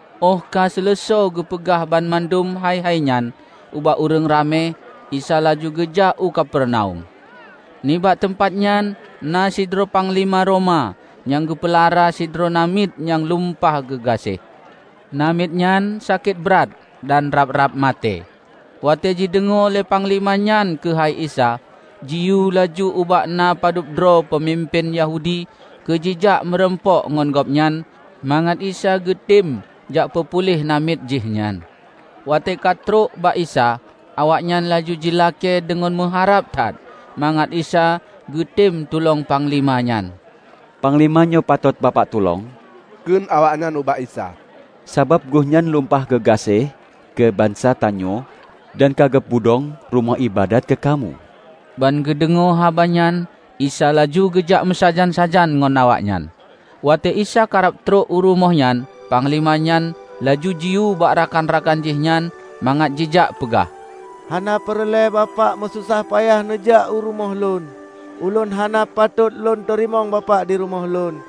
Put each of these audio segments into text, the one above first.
Óh ka seuleusoe geupeugah banmandum hai-hai nyan ubak ureuëng ramé, Isa laju geujak u Kapernaum. Nibak teumpat nyan na sidroe panglima Roma nyang geupeulara sidroe namiet nyang lumpah geugaséh. Namiet nyan sakét brat dan rab-rab maté. Watée jideungoe lé panglima nyan keuhai Isa, jiyue laju ubak na padub droe peumimpén Yahudi keu jijak meurumpok ngon Gobnyan mangat Isa geutem jak peupuléh namiet jih nyan. Watée ka trok bak Isa, awaknyan laju jilakée deungon meuharab that mangat Isa geutem tulông panglima nyan, "Panglima nyoe patot Bapak tulông," kheun awaknyan ubak Isa, "sabab geuhnyan lumpah geugaséh keu bansa tanyoe dan ka geupeudong rumoh iébadat keu kamoe." Ban geudeungoe haba nyan Isa laju geujak meusajan-sajan ngon awaknyan. Watée Isa karab trok u rumoh nyan, panglima nyan laju jiyue bak rakan-rakan jihnyan mangat jijak peugah, "Hana peureulée Bapak meusosah payah neujak u rumoh lôn. Ulôn hana patôt lôn teurimong Bapak di rumoh lôn.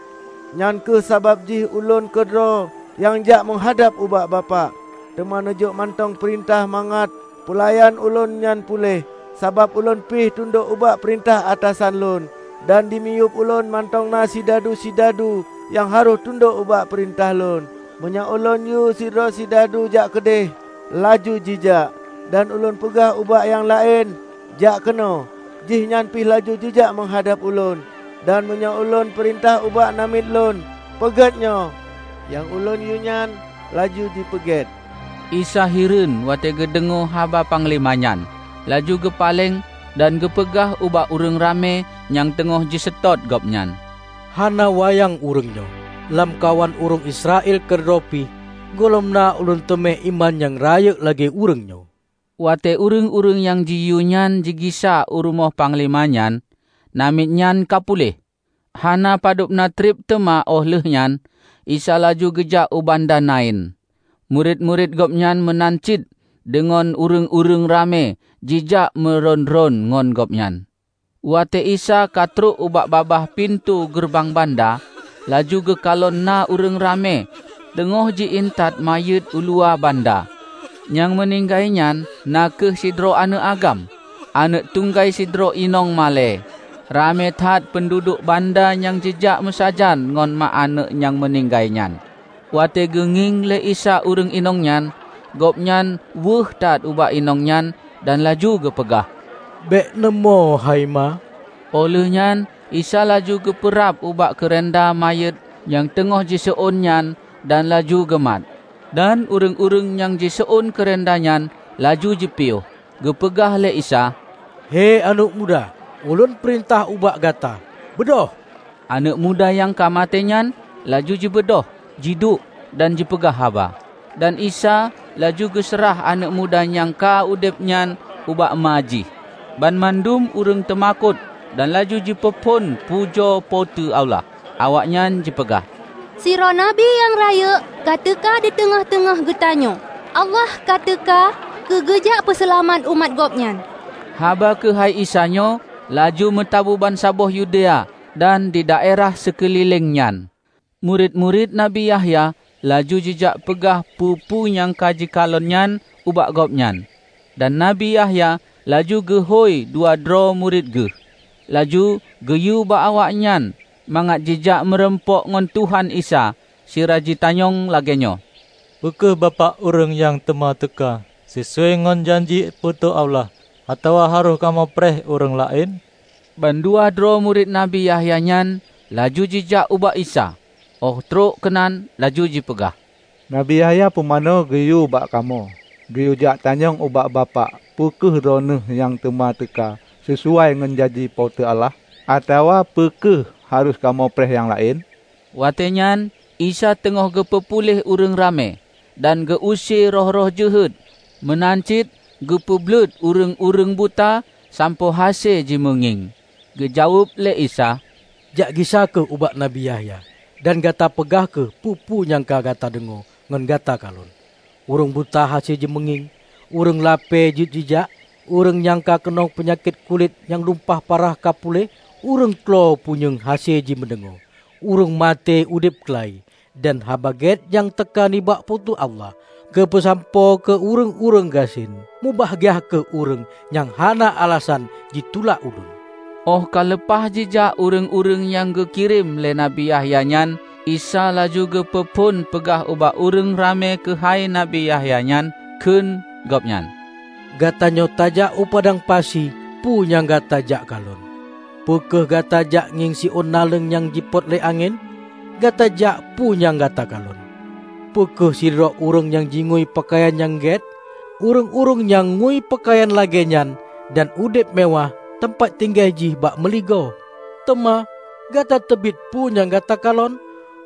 Nyang kheueh sabab jih ulôn keudroe nyang jak meuhadab ubak Bapak. Teuma neujok mantong peurintah mangat peulayan ulôn nyan puléh. Sabab ulôn pih tundok ubak peurintah atasan lôn dan dimiyueb ulôn mantong na sidadu-sidadu nyang harôh tundok ubak peurintah lôn. Meunyoe ulôn yue sidroe sidadu, 'Jak keudeh!' laju jijak; dan ulôn peugah ubak nyang laén, 'Jak keunoe!' jihnyan pih laju jijak meuhadab ulôn. Dan meunyoe ulôn peurintah ubak namiet lôn, 'Peugét nyoe!' nyang ulôn yue nyan laju jipeugét." Isa hireuen watée geudeungoe haba panglima nyan. Laju geupaleng dan geupeugah ubak ureuëng ramé nyang teungoh jiseutôt gobnyan, "Hana wayang ureuëng nyoe. Lamkawan ureuëng Israel keudroe pih gohlom na ulôn teumé iman nyang rayeuk lagée ureuëng nyoe!" Watée ureuëng-ureuëng nyang jiyue nyan jigisa u rumoh panglima nyan, namiet nyan ka puléh. Hana padubna treb teuma óh lheueh nyan, Isa laju geujak u banda Nain. Murit-murit Gobnyan meunan cit deungon ureuëng-ureuëng ramé jijak meurôn-rôn ngon Gobnyan. Watée Isa ka trok ubak babah pintoe geureubang banda, laju geukalon na ureuëng ramé teungoh ji-intat manyét uluwa banda. Nyang meuninggai nyan na kheueh sidroe aneuëk agam, aneuëk tunggai sidroe inong malée. Ramé that peunduduek banda nyang jijak meusajan ngon mak aneuëk nyang meuninggai nyan. Watée geungieng lé Isa ureuëng inong nyan, Gobnyan weueh that ubak inong nyan dan laju geupeugah, "Bék neumoe, hai ma!" Óh lheueh nyan Isa laju geupeurab ubak keureunda manyét nyang teungoh jiseuôn nyan dan laju geumat. Dan ureuëng-ureuëng nyang seuôn keureunda nyan laju jipiôh. Geupeugah lé Isa, "Hei aneuëk muda, Ulôn peurintah ubak gata, beudôh!" Aneuëk muda nyang ka maté nyan laju jibeudôh jiduek dan jipeugah haba. Dan Isa laju geuseurah aneuëk muda nyang ka udeb nyan ubak ma jih. Banmandum ureuëng temakot dan laju jipeuphon pujoe Po teu Allah. Awaknyan jipeugah, "Sidroe Nabi nyang rayeuk ka teuka diteungoh-teungoh geutanyoe! Allah ka teuka keu geujak peuseulamat umat Gobnyan!" Haba keuhai Isa nyoe laju meutabu bansaboh Yudea dan didaerah sikeulileng nyan. Murit-murit Nabi Yahya laju jijak peugah peue-peue nyang ka jikalon nyan ubak gobnyan. Dan Nabi Yahya laju geuhôi dua droe murit geuh laju geuyue bak awaknyan mangat jijak meurumpok ngon Tuhan Isa sira jitanyong lagée nyoe, "Peu kheueh Bapak ureuëng nyang teuma teuka sisuai ngon janji Po teu Allah, atawa harôh kamoe preh ureuëng laén?" Bandua droe murit Nabi Yahya nyan laju jijak ubak Isa óh trok keunan laju jipeugah, "Nabi Yahya Pumanö geuyue bak kamoe geuyue jak tanyong ubak Bapak peu kheueh Droeneueh nyang teuma teuka sisuai ngon janji Po teu Allah, atawa peu kheueh harôh kamoe preh nyang laén?" Watée nyan, Isa teungoh geupeu puléh ureuëng ramé, dan geu-use roh-roh jeuhet meunan cit geupeu bleuet ureuëng-ureuëng buta sampoe hase jimeungieng. Geujaweueb lé Isa, "Jak gisa kheueh ubak Nabi Yahya dan gata peugah kheueh peue-peue nyang ka gata deungoe ngon gata kalon: ureuëng buta hase jimeungieng, ureuëng lapée jeuet jijak, ureuëng nyang keunong peunyakét lulét nyang lumpah parah ka puléh, ureuëng klo punyueng hase jimeudeungoe, ureuëng maté udeb keula-i, dan Haba Gét nyang teuka nibak Po teu Allah geupeusampoe keu ureuëng-ureuëng gasien. Mubahgia kheueh ureuëng nyang hana alasan jitulak ulôn." Óh ka leupah jijak ureuëng-ureuëng nyang geukirém lé Nabi Yahya nyan, Isa laju geupeu phon peugah ubak ureuëng ramé keuhai Nabi Yahya nyan, kheueh gobnyan, "Gatanyoe tajak u padang pasi peue nyang gata jak kalon? Peu kheueh gata jak ngieng siôn naleueng nyang jipot lé angén? Gata jak peue nyang gata kalon? Peu kheueh sidroe ureuëng nyang jingui peukayan nyang gét? Ureuëng-ureuëng nyang ngui peukayan lagée nyan dan udeb meuwáh teumpat tinggai jih bak meuligoe! Teuma, gata teubiet peue nyang gata kalon?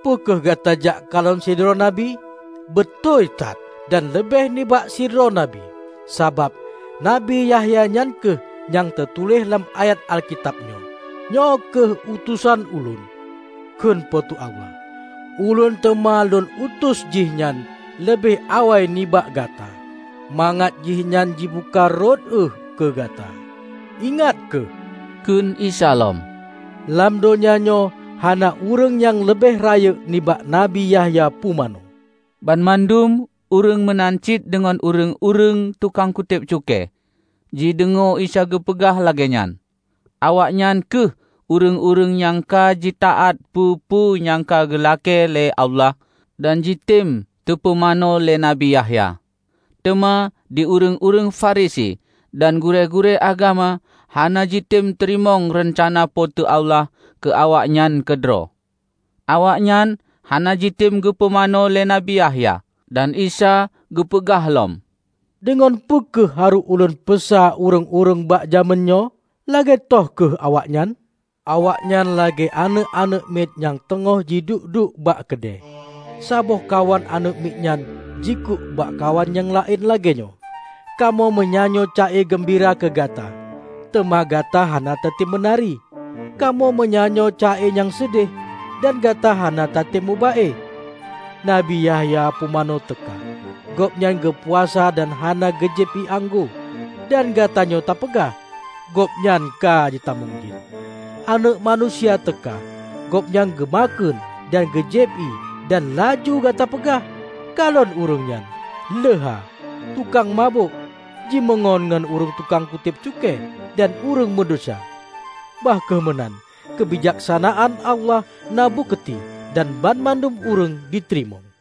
Peu kheueh gata jak kalon sidroe nabi? Beutôi that, dan leubeh nibak sidroe nabi. Sabab, Nabi Yahya nyan kheueh nyang teutuléh lam ayat Alkitab nyoe, 'Nyoe kheueh utosan Ulôn,' kheun Po teu Allah, 'Ulôn teuma lôn utus jihnyan leubeh awai nibak Gata, mangat jihnyan jibuka rot ueh keu Gata!' " "Ingat kheueh," kheun Isa lom, "lam donya nyoe hana ureuëng nyang leubeh rayeuk nibak Nabi Yahya Pumanö." Banmandum -- ureuëng meunan cit deungon ureuëng-ureuëng tukang kutéb cukée -- jideungoe Isa geupeugah lagée nyan; awaknyan kheueh ureuëng-ureuëng nyang ka jitaát peue-peue nyang ka geulakée lé Allah dan jitem teupumanö lé Nabi Yahya. Teuma di ureuëng-ureuëng Farisi dan gurée-gurée agama hana jitem teurimong reuncana Po teu Allah keu awaknyan keudroe. Awaknyan hana jitem geupumanö lé Nabi Yahya. Dan Isa geupeugah lom, "Deungon peu kheueh harôh Ulôn peusa ureuëng-ureuëng bak jamén nyoe? Lagée toh kheueh awaknyan? Awaknyan lagée aneuëk-aneuëk miet nyang teungoh jiduek-duek bak keudée; saboh kawan aneuëk miet nyan jikuk bak kawan nyang laén lagée nyoe, 'Kamoe meunyanyoe ca-e geumbira keu gata, teuma gata hana tatem meunari! Kamoe meunyanyoe ca-e nyang seudeh, dan gata hana tatem moba-e!' Nabi Yahya Pumanö teuka -- gobnyan geupuasa dan hana geujieb ié anggô -- dan gatanyoe ta peugah, 'Gobnyan ka jitamong jén!' Aneuëk Manusia teuka -- Gobnyan geumakheun dan geujieb ié -- dan laju gata peugah, 'Kalon ureuëng nyan! Leuha, tukang mabök, jimeungon ngon ureuëng tukang kutéb cukée dan ureuëng meudesya.' Bah kheueh meunan, keubijaksanaan Allah na bukeuti dan banmandum ureuëng jiteurimong"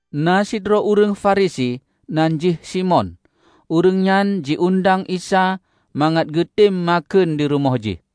Na sidroe ureuëng Farisi, nan jih Simon, ureuëng nyan ji-undang Isa mangat geutem makheun dirumoh jih.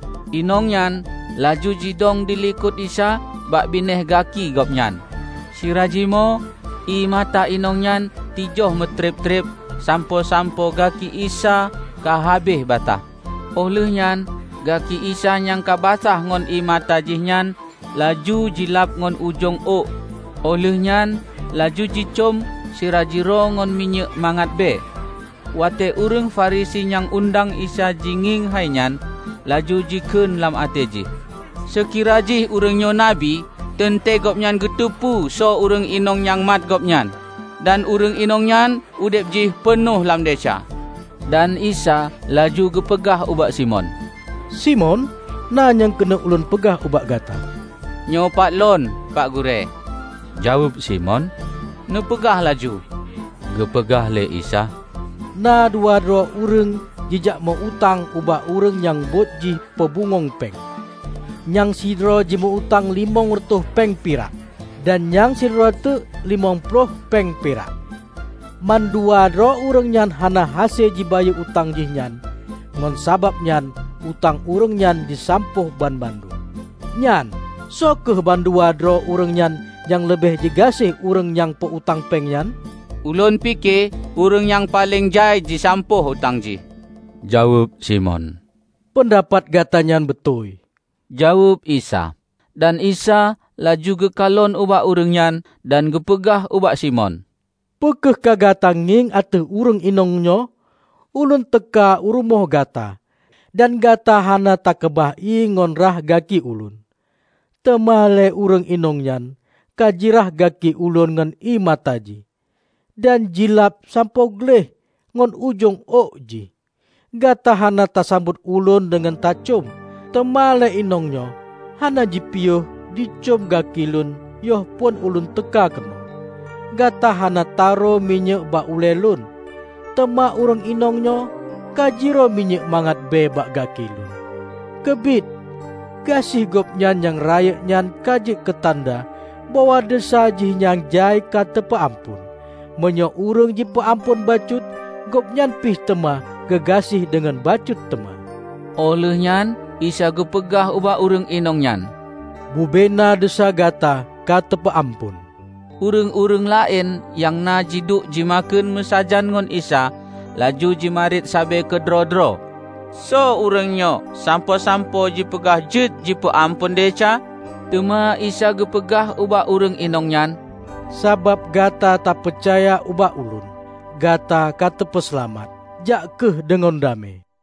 Inong nyan laju jidong dilikot Isa bak binéh gaki Gobnyan, sira jimoe ié mata inong nyan tijoh meutreb-treb sampoe-sampoe gaki Isa ka habéh basah. Óh lheuehnyan gaki Isa nyang ka basah ngon ié mata jihnyan laju jilab ngon ujong ôk óh lheuehnyan laju jicöm sira jiroe ngon minyéuk mangat bhée. Watée ureuëng Farisi nyang undang Isa jingieng hai nyan, laju jikheun lam até jih, "Seukira jih ureuëng nyoe Nabi, teuntée gobnyan geuteupeue soe ureuëng inong nyang mat Gobnyan, dan ureuëng inong nyan udeb jih peunoh lam desya!" Dan Isa laju geupeugah ubak Simon, "Simon, na nyang keuneuk ulôn peugah ubak gata." "Nyoe pat lôn, Pak Gurée," jaweueb Simon, "Neupeugah laju." Geupeugah lé Isa, "Na dua droe ureuëng jijak meu-utang ubak ureuëng nyang buet jih peubungöng péng. Nyang sidroe jimeu-utang limong reutôh péng pirak, dan nyang sidroe teuk limong ploh péng pirak. Mandua droe ureuëng nyan hana hase jibayeue utang jih nyan, ngon sabab nyan utang ureuëng nyan jisampôh banmandum. Nyan, soe kheueh mandua droe ureuëng nyan nyang leubeh jigaséh ureuëng nyang peu-utang péng nyan?" "Ulôn pike ureuëng nyang paleng jai jisampôh utang jih!" jaweueb Simon. "Peundapat gatanyan beutôi," jaweueb Isa. Dan Isa laju geukalon ubak ureuëng nyan dan geupeugah ubak Simon, "Peu kheueh ka gata ngieng ateueh ureuëng inong nyoe? Ulôn teuka u rumoh gata, dan gata hana takeubah ié ngon rhah gaki Ulôn; teuma lé ureuëng inong nyan ka jirhah gaki Ulôn ngon ié mata jih, dan jilab sampoe gleh ngon ujong ôk jih. Gata hana tasambot Ulôn deungon tacöm, teuma lé inong nyoe hana jipiôh jicöm gaki Lôn yoh phon Ulôn teuka keunoe. Gata hana ta rô minyéuk bak ulee Lon, teuma ureuëng inongnyoe ka jirô minyéuk mangat bée bak gaki Lôn. Keubiet: gaséh gobnyan nyang rayeuk nyan ka jeuet keutanda bahwa desya jih nyang jai ka teupeu amphon! Meunyoe ureuëng jipeu amphon bacut, gobnyan pih teuma geugaséh deungon bacut teuma." Óh lheuehnyan Isa geupeugah ubak ureuëng inong nyan, "Bubena desya gata ka teupeu amphon." Ureuëng-ureuëng laén nyang na jiduek jimakheun meusajan ngon Isa laju jimarit sabe keudroe-droe, "Soe ureuëng nyoe sampoe-sampoe jipeugah jeuet jipeu amphon desya?" Teuma Isa geupeugah ubak ureuëng inong nyan, "Sabab gata tapeucaya ubak Ulôn, gata ka teupeuseulamat. Jak kheueh deungon damé!"